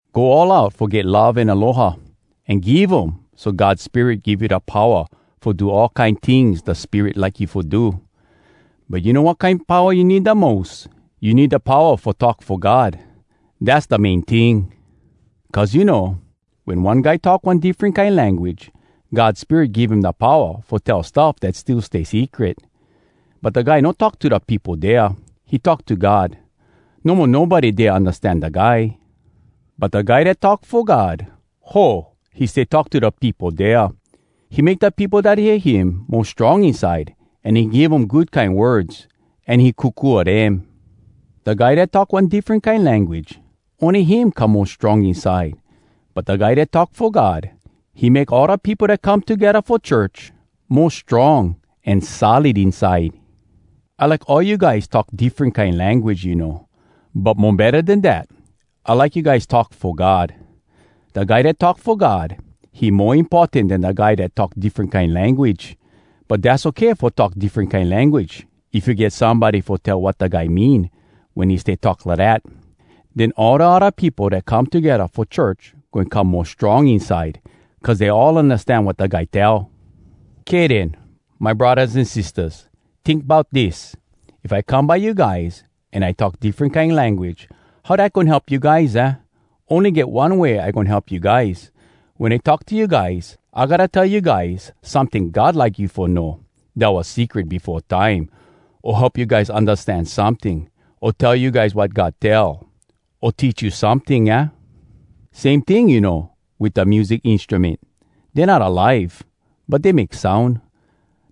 Go all out fo get love an aloha. An geev um so God Spirit give you da powa fo do all kine tings da Spirit like you fo do. But you know wat kine powa you need da mos? You need da powa fo talk fo God, dass da main ting! Cuz you know, wen one guy talk one diffren kine language, God Spirit give him da powa fo tell stuff dat still yet stay secret. But da guy no talk to da peopo dea. He talk to God. No mo nobody dea undastan da guy. But da guy dat talk fo God, ho! he stay talk to da peopo dea. He make da peopo dat hear him mo strong inside, an he give um good kine words, an he kokua dem. Da guy dat talk one diffren kine language, ony him come mo strong inside. But da guy dat talk fo God, he make all da peopo dat come togedda fo church mo strong an solid inside. I like all you guys talk diffren kine language, you know. But mo betta den dat, I like you guys talk fo God. Da guy dat talk fo God, he mo importan den da guy dat talk diffren kine language. But dass okay fo talk diffren kine language, if you get somebody fo tell wat da guy mean wen he stay talk lidat. Den all da odda peopo dat come togedda fo church goin come mo strong inside, cuz dey all undastan wat da guy tell. Kay den, my braddahs an sistahs! Tink bout dis. If I come by you guys, an I talk diffren kine language, how dat goin help you guys, aah? Ony get one way I goin help you guys. Wen I talk to you guys, I gotta tell you guys someting God like you fo know, dat was secret befo time, o help you guys undastan someting, o tell you guys wat God tell, o teach you someting, aah? Same ting, you know, wit da music instrument. Dey not alive, but dey make soun.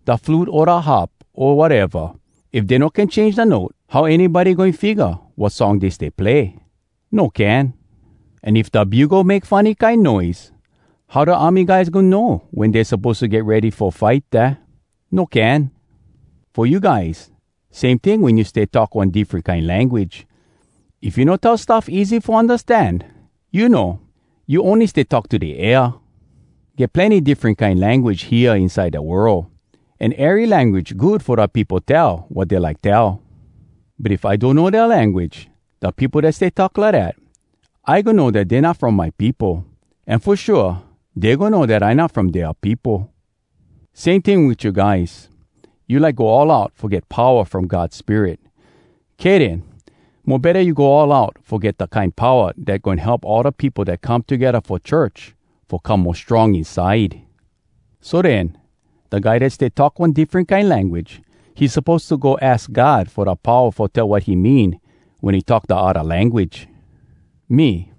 Da flute o da harp o wateva, if dey no can change da note, how anybody goin figga wat song dey stay play? No can. An if da bugle make funny kine noise, how da army guys goin know wen dey suppose to get ready fo fight, aah? No can. Fo you guys, same ting wen you stay talk one diffren kine language—if you no tell stuff easy fo undastan, you know, you ony stay talk to da air. Get plenny diffren kine language hea inside da world, an ery language good fo da peopo tell wat dey like tell. But if I donno dea language, da peopo dat stay talk lidat, I goin know dat dey not from my peopo, an fo shua dey goin know dat I not from dea peopo. Same ting wit you guys—you like go all out fo get powa from God Spirit. Kay den. Mo betta you go all out fo get da kine powa dat goin help all da peopo dat come togedda fo church fo come mo strong inside! So den, da guy dat stay talk one diffren kine language, he suppose to go aks God fo da powa fo tell wat he mean wen he talk da odda language. Me,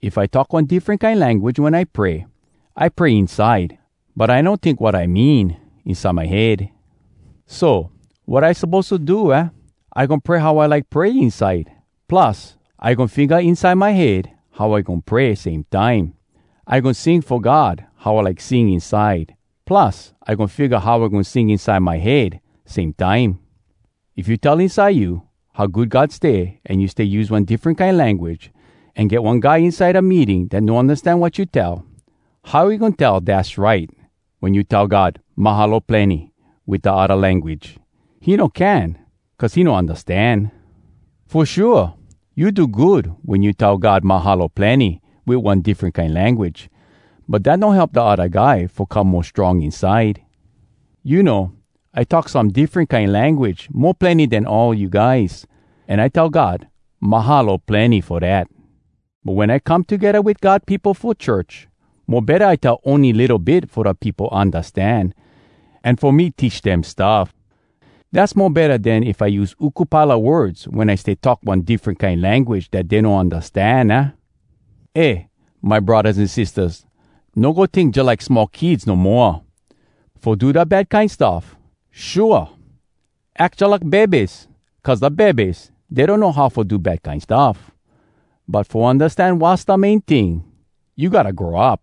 if I talk one diffren kine language wen I pray, I pray inside, but I no tink wat I mean inside my head. So, wat I suppose to do, aah? I goin pray how I like pray inside, plus, I goin figga inside my head how I goin pray, same time. I goin sing fo God how I like sing inside, plus, I goin figga how I goin sing inside my head, same time. If you tell inside you how good God stay an you stay use one diffren kine language, an get one guy inside da meeting dat no undastan wat you tell, how he goin tell “Dass right!” wen you tell God, “Mahalo plenny!” wit da odda language? He no can cuz he no undastan. Fo shua, you do good wen you tell God “Mahalo plenny!” wit one diffren kine language. But dat no help da odda guy fo come mo strong inside. You know, I talk some diffren kine language mo plenny den all you guys, an I tell God “Mahalo plenny!” fo dat. But wen I come togedda wit God peopo fo church, mo betta I tell ony litto bit fo da peopo undastan, an fo me teach dem stuff. Dass mo betta den if I use uku pile a words wen I stay talk one diffren kine language dat dey no undastan, aah? Eh, my braddahs an sistahs! No go tink jalike small kids no moa! (Fo do da bad kine stuff, shua! Ack jalike bebes! Cuz da bebes, dey donno how fo do bad kine stuff.) But fo undastan wass da main ting, you gotta grow up!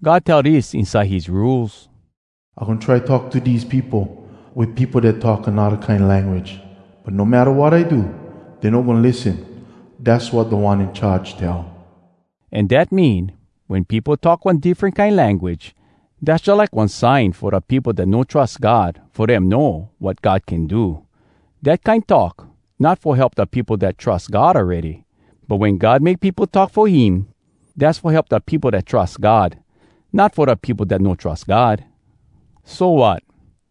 God tell dis inside his Rules: “I goin try talk to dese peopo Wit peopo dat talk anodda kine language. But no matta wat I do, dey no goin lissen. Dass wat Da One In Charge tell.” An dat mean, wen peopo talk one diffren kine language, dass jalike one sign fo da peopo dat no trus God fo dem know wat God can do. Dat kine talk, not fo help da peopo dat trus God awready. But wen God make peopo talk fo him, dass fo help da peopo dat trus God, not fo da peopo dat no trus God. So, wat?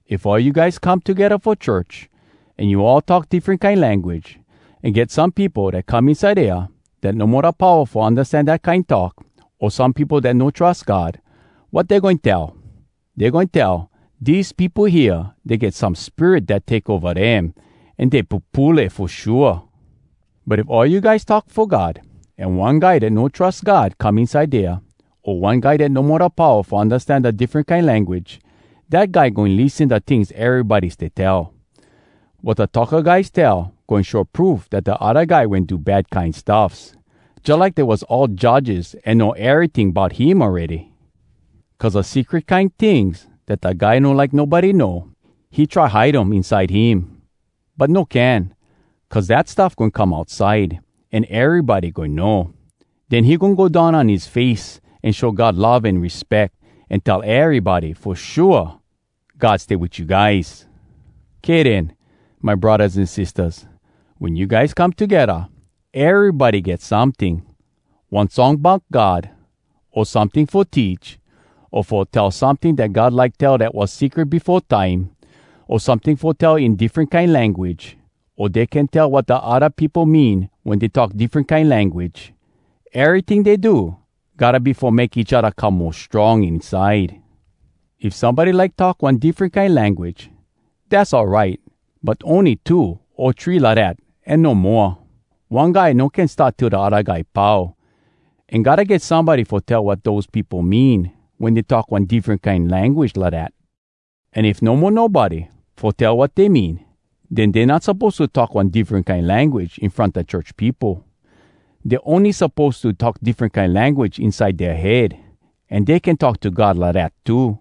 If all you guys come togedda fo church, an you all talk diffren kine language, an get some peopo dat come inside dea dat no mo da powa fo undastan dat kine talk, o some peopo dat no trus God, wat dey goin tell? Dey goin tell, “Dese peopo hea, dey get some spirit dat take ova dem, an dey pupule fo shua!” But if all you guys talk fo God, an one guy dat no trus God come inside dea, o one guy dat no mo da powa fo undastan da diffren kine language, dat guy goin lissen da tings erybody stay tell. Wat da talka guys tell goin show proof dat da odda guy wen do bad kine stuffs, jalike dey was all judges an know eryting bout him awready. Cuz da secret kine tings dat da guy no like nobody know, he try hide um inside him, but no can, cuz dat stuff goin come outside an erybody goin know. Den he goin go down on his face an show God love an respeck, an tell erybody, “Fo shua, God stay wit you guys!” Kay den, my braddahs an sistahs. Wen you guys come togedda, erybody get someting—one song bout God, o someting fo teach, o fo tell someting dat God like tell dat was secret befo time, o someting fo tell in diffren kine language, o dey can tell wat da odda peopo mean wen dey talk diffren kine language. Eryting dey do, gotta be fo make each odda come mo strong inside. If somebody like talk one diffren kine language, dass all right, but ony two o three lidat an no moa. One guy no can start till da odda guy pau, an gotta get somebody fo tell wat dose peopo mean wen dey talk one diffren kine language lidat. An if no mo nobody fo tell wat dey mean, den dey not suppose to talk one diffren kine language in front da church peopo. Dey ony suppose to talk diffren kine language inside dea head, an dey can talk to God lidat too.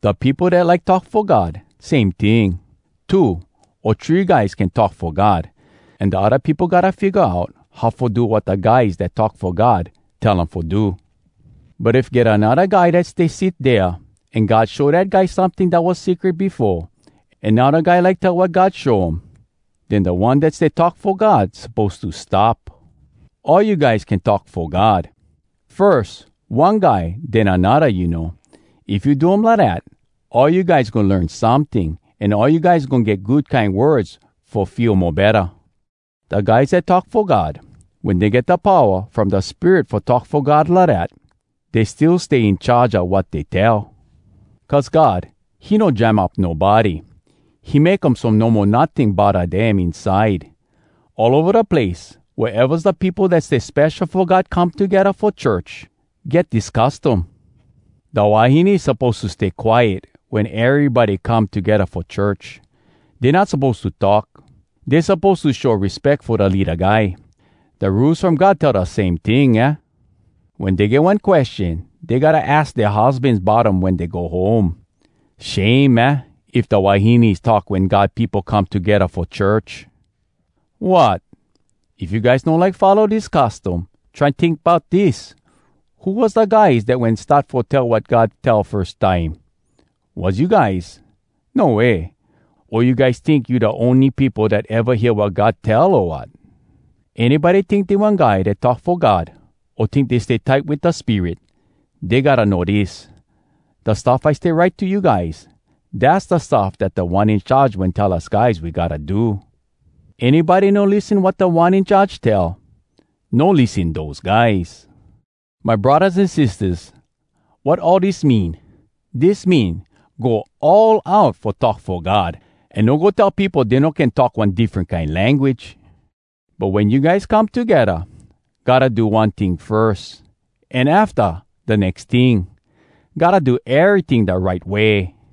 Da peopo dat like talk fo God, same ting: two o three guys can talk fo God, an da odda peopo gotta figga out how fo do wat da guys dat talk fo God tell um fo do. But if get anodda guy dat stay sit dea, an God show dat guy someting dat was secret befo, an now da guy like tell wat God show um, den da one dat stay talk fo God suppose to stop. All you guys can talk fo God, firs one guy den anodda, you know. If you do um lidat, all you guys goin learn someting, an all you guys goin get good kine words fo feel mo betta. Da guys dat talk fo God, wen dey get da powa from da Spirit fo talk fo God lidat, dey still stay in charge a wat dey tell. Cuz God, he no jam up nobody. He make um so no mo notting bodda dem inside. All ova da place, wea evas da peopo dat stay spesho fo God come togedda fo church, get dis custom: Da wahines suppose to stay quiet wen erybody come togedda fo church. Dey not suppose to talk. Dey suppose to show respeck fo da leada guy. Da Rules From God tell da same ting, aah? Wen dey get one question, dey gotta aks dea husbans bout um wen dey go home. Shame, aah? if da wahines talk wen God peopo come togedda fo church! Wot! If you guys no like follow dis custom, try tink bout dis: Who was da guys dat wen start fo tell wat God tell, firs time? Was you guys? No way! O you guys tink you da ony peopo dat eva hear wat God tell, o wat?! Anybody tink dey one guy dat talk fo God, o tink dey stay tight wit da Spirit, dey gotta know dis: Da stuff I stay write to you guys, dass da stuff dat Da One In Charge wen tell us guys we gotta do. Anybody no lissen wat Da One In Charge tell, no lissen dose guys! My braddahs an sistahs, wat all dis mean?! Dis mean, go all out fo talk fo God! An no go tell peopo dey no can talk one diffren kine language. But wen you guys come togedda, gotta do one ting firs, an afta, da nex ting. Gotta do eryting da right way.